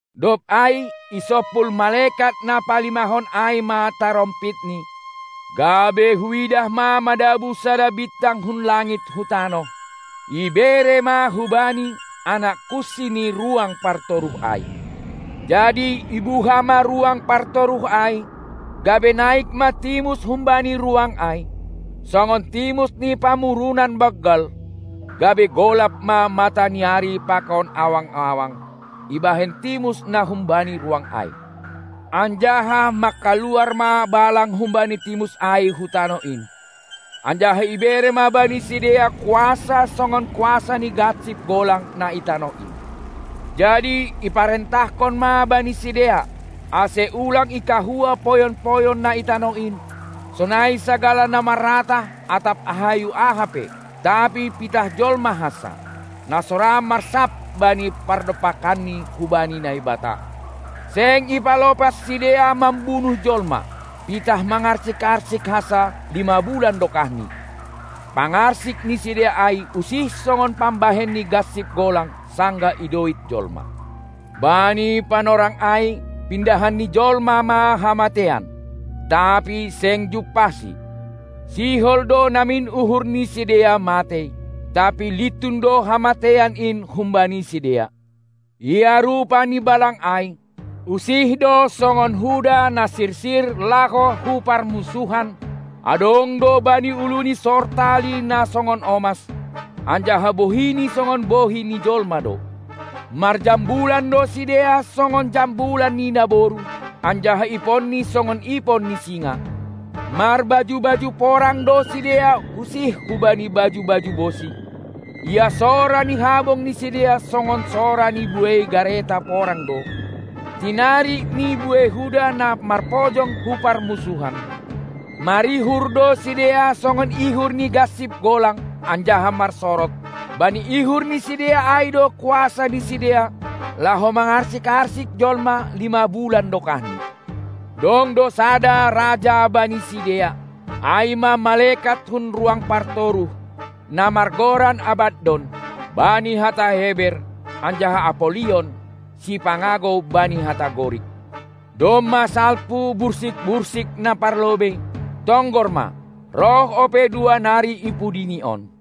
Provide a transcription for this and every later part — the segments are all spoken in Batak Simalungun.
Dob ai isompul malekat na palimahon ai ma tarompitni, gabe huidah ma madabuh sada bintang hun langit hu tanoh; ibere ma hubani anak kunsi ni ruang partoruh ai. Jadi ibuha ma ruang partoruh ai, gabe naik ma timus humbani ruang ai, songon timus ni pamurunan banggal, gabe golap ma mata ni ari pakon awang-awang ibahen timus na humbani ruang ai. Anjaha mangkaluar ma balang humbani timus ai hu tanoh in, anjaha ibere ma bani sidea kuasa songon kuasa ni gansip golang na i tanoh in. Jadi iparentahkon ma bani sidea, ase ulang ikahua poyon-poyon na i tanoh in, sonai sagala na maratah atap hayu aha pe, tapi pitah jolma hansa, na so marsap bani pardompakanni humbani Naibata. Seng ipalopas sidea mambunuh jolma, pitah mangarsik-arsik hansa lima bulan dokahni; pangarsik ni sidea ai usih songon pambahen ni gansip golang sanggah idoit jolma. Bani panorang ai pindahan ni jolma ma hamateian, tapi seng jumpahsi; sihol do namin uhur ni sidea matei, tapi lintun do hamateian in humbani sidea. Ia rupa ni balang ai, usih do songon huda na sirsir laho hu parmunsuhan; adong do bani uluni sortali na songon omas, anjaha bohini songon bohi ni jolma do. Marjambulan do sidea songon jambulan ni naboru, anjaha iponni songon ipon ni singa. Marbaju-baju porang do sidea usih hubani baju-baju bosi; ia sora ni habong ni sidea songon sora ni buei gareta porang do, tinarik ni buei huda na marpojong hu parmunsuhan. Marihur do sidea songon ihur ni gansip golang anjaha marsorod; bani ihur ni sidea ai do kuasa ni sidea laho mangarsik-arsik jolma lima bulan dokahni. Dong do sada raja bani sidea, ai ma malekat hun ruang partoruh, na margoran Abaddon bani hata Heber anjaha Apollion (sipangagou) bani hata Gorik. Domma salpu bursik-bursik na parlobei; tonggor ma, roh ope dua nari ipudi ni on.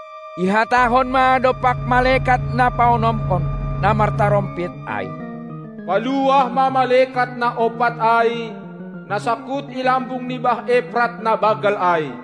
Ihatahon ma dompak malekat na paonomkon, na martarompit ai: Paluah ma malekat na ompat ai, na sangkut ilambung ni bah Eprat na banggal ai!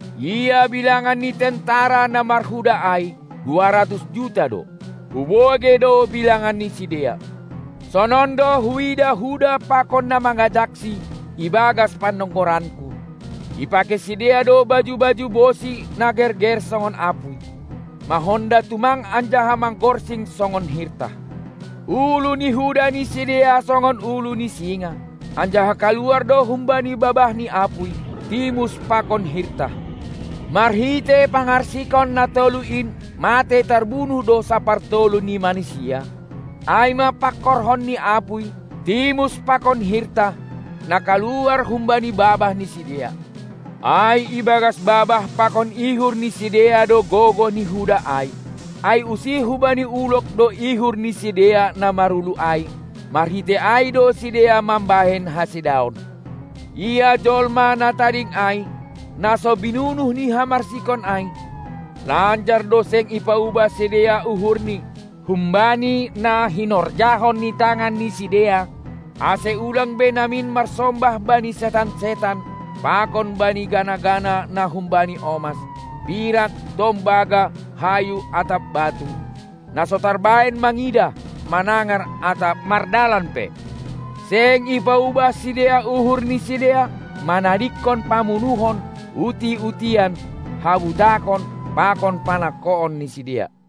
Ia bilangan ni tentara na marhuda ai duaratus juta do; hubogei do bilangan ni sidea. Sonon do huidah huda pakon na mangajaksi ibagas panonggoranku: Ipakei sidea do baju-baju bosi na gerger songon apuy, mahonda tumang anjaha magorsing songon hirtah. Ulu ni huda ni sidea songon ulu ni singa, anjaha kaluar do humbani babahni apuy, timus pakon hirtah. Marhitei pangarsikon na tolu in matei tarbunuh do sapartolu ni manisia, ai ma pangkorhon ni apuy, timus pakon hirtah, na kaluar humbani babah ni sidea. Ai ibagas babah pakon ihur ni sidea do gogoh ni huda ai; ai usih hubani ulog do ihur ni sidea na marulu ai, marhitei ai do sidea mambahen hasedaon. Ia jolma na tading ai, na so binunuh ni hamarsikon ai, lanjar do seng ipaubah sidea uhurni humbani na hinorjahon ni tangan ni sidea, ase ulang be namin marsombah bani setan-setan pakon bani gana-gana na humbani omas, pirak, tombaga, hayu atap batu, na so tarbahen mangidah, manangar atap mardalan pe. Seng ipaubah sidea uhur ni sidea manadingkon pamunuhon, uti-utian, habutakon pakon panangkoon ni sidea.